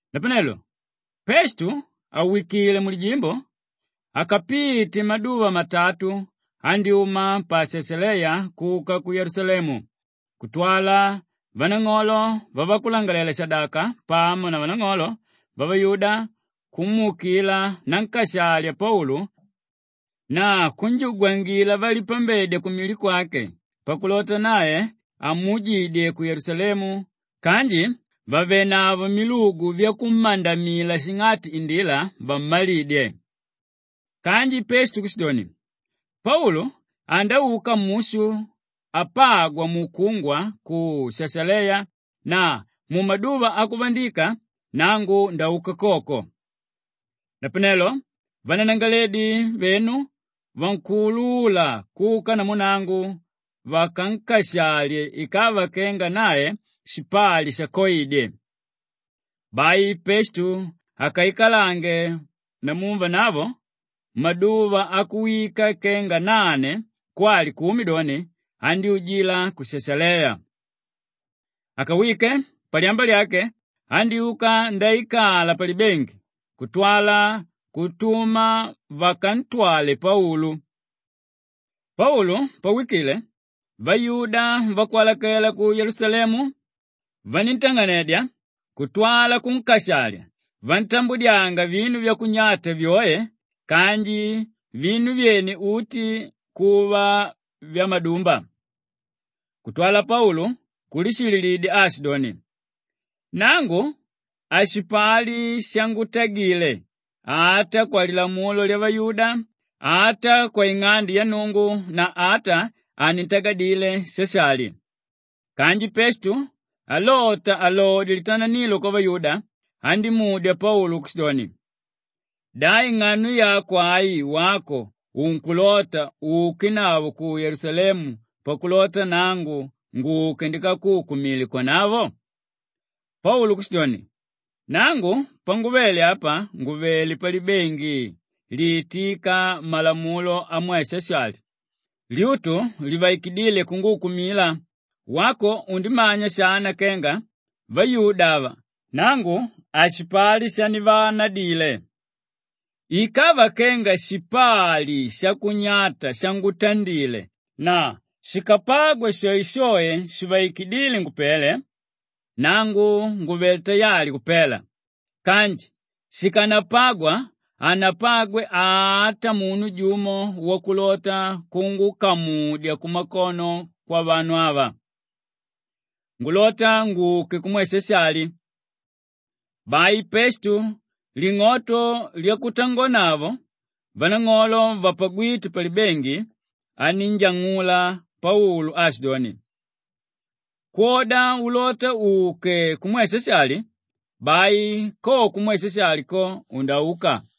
Napanelo Pestu àwikile mulijimbo, akapite maduva matatu andyúma pa Shashaleya kuka ku Yelusalemu kutwala vanang'olo vavakulangalalela-shadaka pamo na vanang'olo vavayuda kumuukila nankashali Paulu na kunjugwangila valipambedya kumili kwake pakulota nae amuujidye ku Yelusalemu kanji vàvenavo milugu vyakummandamila shing'ati indila vammalidye. Kanji Pestu kushidoni, “Paulu andauka mushu apagwa mukungwa ku Shashaleya na mumaduva akuvandika nangu ndauka koko. Napanelo vananangalaledi venu vankuulula kuka namu nangu vakankashalye ikava kenga nae shipali shakoidye.” Bai Pestu akaikalange namu vanavo maduva akuwika kenga nane kwali kumi doni, andyújila ku Shashaleya. Akawike, palyamba lyake andyúka ndaikala palibengi kutwala kutuma vakantwale Paulu. Paulu pawikile, vayuda vakwalakela ku Yelusalemu vaníntang'anedya kutwala kunkashalya vantambudyanga vinu vyakunyata vyoe kanji vinu vyene uti kuva vyamadumba. Kutwala Paulu kulishililidya aashidoni, “Nangu hashipali shangutagile; ata kwalilamulo lyavayuda, ata kwaing'ande ya Nnungu na ata hanintagadile Shashali.” Kanji Pestu alota alodye litananilo kwavayuda, andímudya Paulu kushidoni, “Da ing'ano yako ai wako unkulota uukenavo ku Yelusalemu pakulota nangu nguke ndikakuukumile kwanavo?” Paulu kushidoni, “Nangu panguvele apa nguvelé palibengi liitíka malamulo amwe Shashali, lyutu livaikidíle kunguukumila; wako undimanya shana kenga vayuda ava nangu hashipali shandivaanadile. Ikava kenga shipali shakunyata shangutandile na shikapagwa shoeshoe shivaikidíle ngupele, nangu nguvelé tayali kupela. Kanji shikanapagwa, hanapagwe ata munu jumo wakulota kungukamudya kumakono kwavanu ava. Ngulota nguke kumwe Shashali.” Bai Pestu ling'oto lyakutangonavo vanang'olo vapagwíte palibengi anínjang'ula Paulu aashidoni, “Kwoda ulota uke kumwe Shashali, bai ko kumwe Shashali ko, undauka.”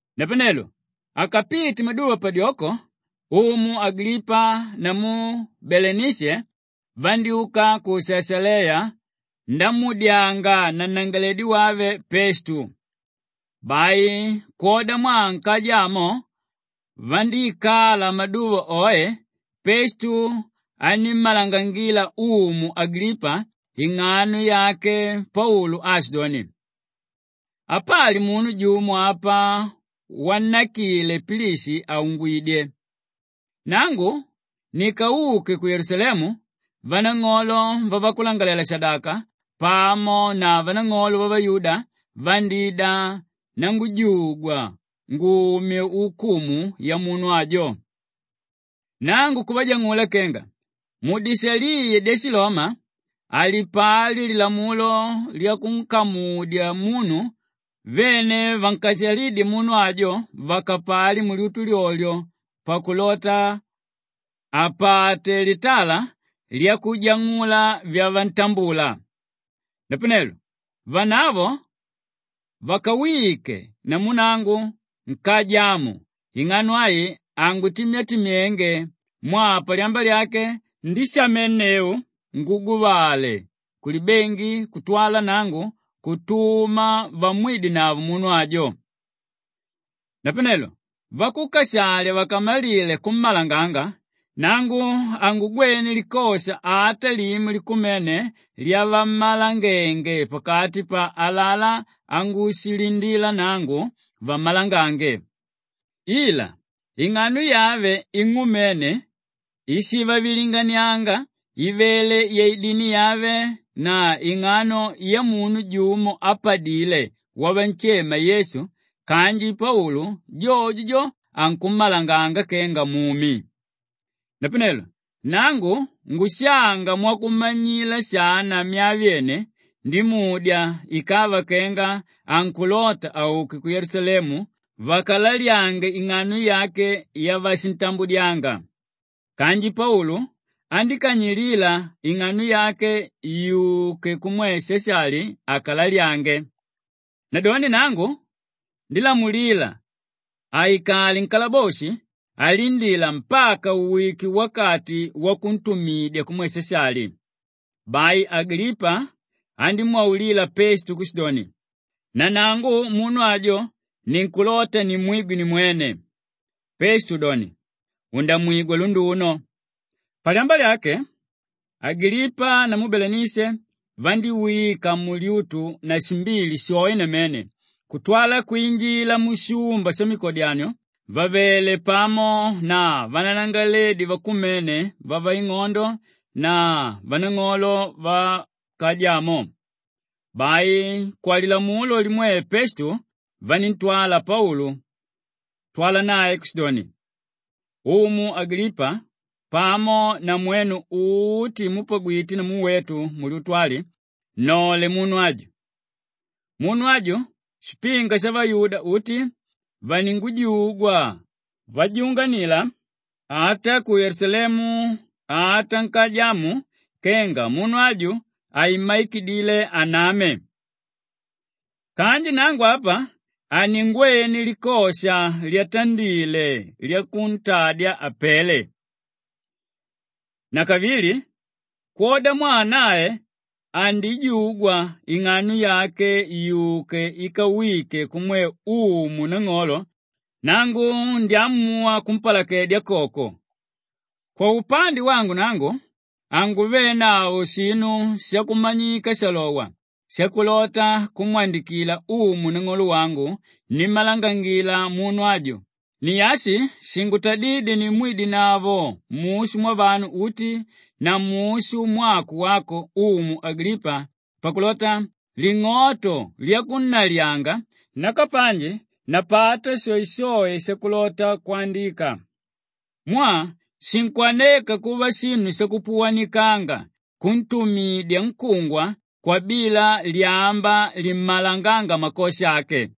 Napanelo akapite maduva padyoko, umu Agilipa namu Belenishe vandyúka ku Shashaleya ndamuudyanga nanangalaledi wave Pestu. Bai kwodamwaa nkaja amo vandíikala maduva oe, Pestu anímmalangangila umu Agilipa ing'ano yake Paulu aashidoni, “Apali munu jumo apa wannakile Pilishi àungwidye. Nangu nikauke ku Yelusalemu, vanang'olo vavakulangalalela-shadaka pamo na vanang'olo vavayuda vandída nangujugwa ngumye ukumu yamunu ajo. “Nangu kuvajang'ula kenga mudishaliya dyashiloma halipali lilamulo lyakunkamudya munu vene vankashalídye munu ajo vakapali mulyutu lyolyo pakulota apate litala lyakujang'ula vyavantambula. Napanelo vanavo vakawike namu nangu nkaja amu ing'ano ai hangutimyatimyenge mwaa palyamba lyake ndíshamenneu nguguvale kulibengi kutwala nangu kutuma vamwidenavo munu ajo. Napanelo vakukashalya vakamalile kummalanganga, nangu hangugwene likosha ata limo likumene lyavammalangenge pakati pa alalá angushilindila nangu vammalangange. Ila ing'ano yave ing'umene íshivavilinganianga ivele yaidini yave na ing'ano yamunu jumo ápadile wavanshema Yesu kanji Paulu jojo jo, ankummalanganga kenga mumi. “Napanelo nangu ngushanga mwakumanyila shana myaa vyene, ndimudya ikava kenga ankulota auke ku Yelusalemu vakalalyange ing'ano yake yavashintambudyanga. Kanji Paulu andíkanyilila ing'ano yake yuke kumwe Shashali akalalyange. Nadoni nangu ndílamulila aikale nkalaboshi alindila mpaka uwike wakati wakuntumidya kumwe Shashali.” Bai Agilipa andímwaulila Pestu kushidoni, “Nanangu munu ajo ninkulota nimwigwe nimwene.” Pestu doni, “Undamwigwa lunduno.” Palyamba lyake Agilipa namu Belenishe vandíwika mulyutu na shimbili shoe namene kutwala kwinjila mushumba shamikodyanio vàvele pamo na vananangalaledi vakumene vavaing'ondo na vanang'olo vankaja amo. Bai kwalilamulo limwe Pestu vaníntwala Paulu kutwala nae kushidoni, “Umu Agilipa pamo na mwenu uti múpagwite namu wetu mulyutu ali, nnole munu aju! Munu aju, shipinga shavayuda uti vaningujugwa vajunganila ata ku Yelusalemu ata nkaja amu kenga munu aju, haimmaikidile aname. Kanji nangu apa haningwene likosha lyatandile lyakuntadya apele. Nakavili kwodamwaa nae andijugwa ing'ano yake yuke ikawike kumwe umu nang'olo, nangu ndyamuwa kumpalakedya koko. Kwaupande wangu nangu hanguvenavo shinu shakumanyika shalowa shakulota kumwandikila umu nang'olo wangu nimmalanganga munu aju; ni ashi shingutadídye nimwidenavo mushu mwavanu uti na mushu mwako wako Umu Agilipa pakulota ling'oto lyakunnalyanga nakapanji ndapata shoeshoe shakulota kwandika. Mwaa shinkwaneka kuva shinu shakupuwanikanga kuntumidya nkungwa kwabila lyamba limmalangánga makosha ake.”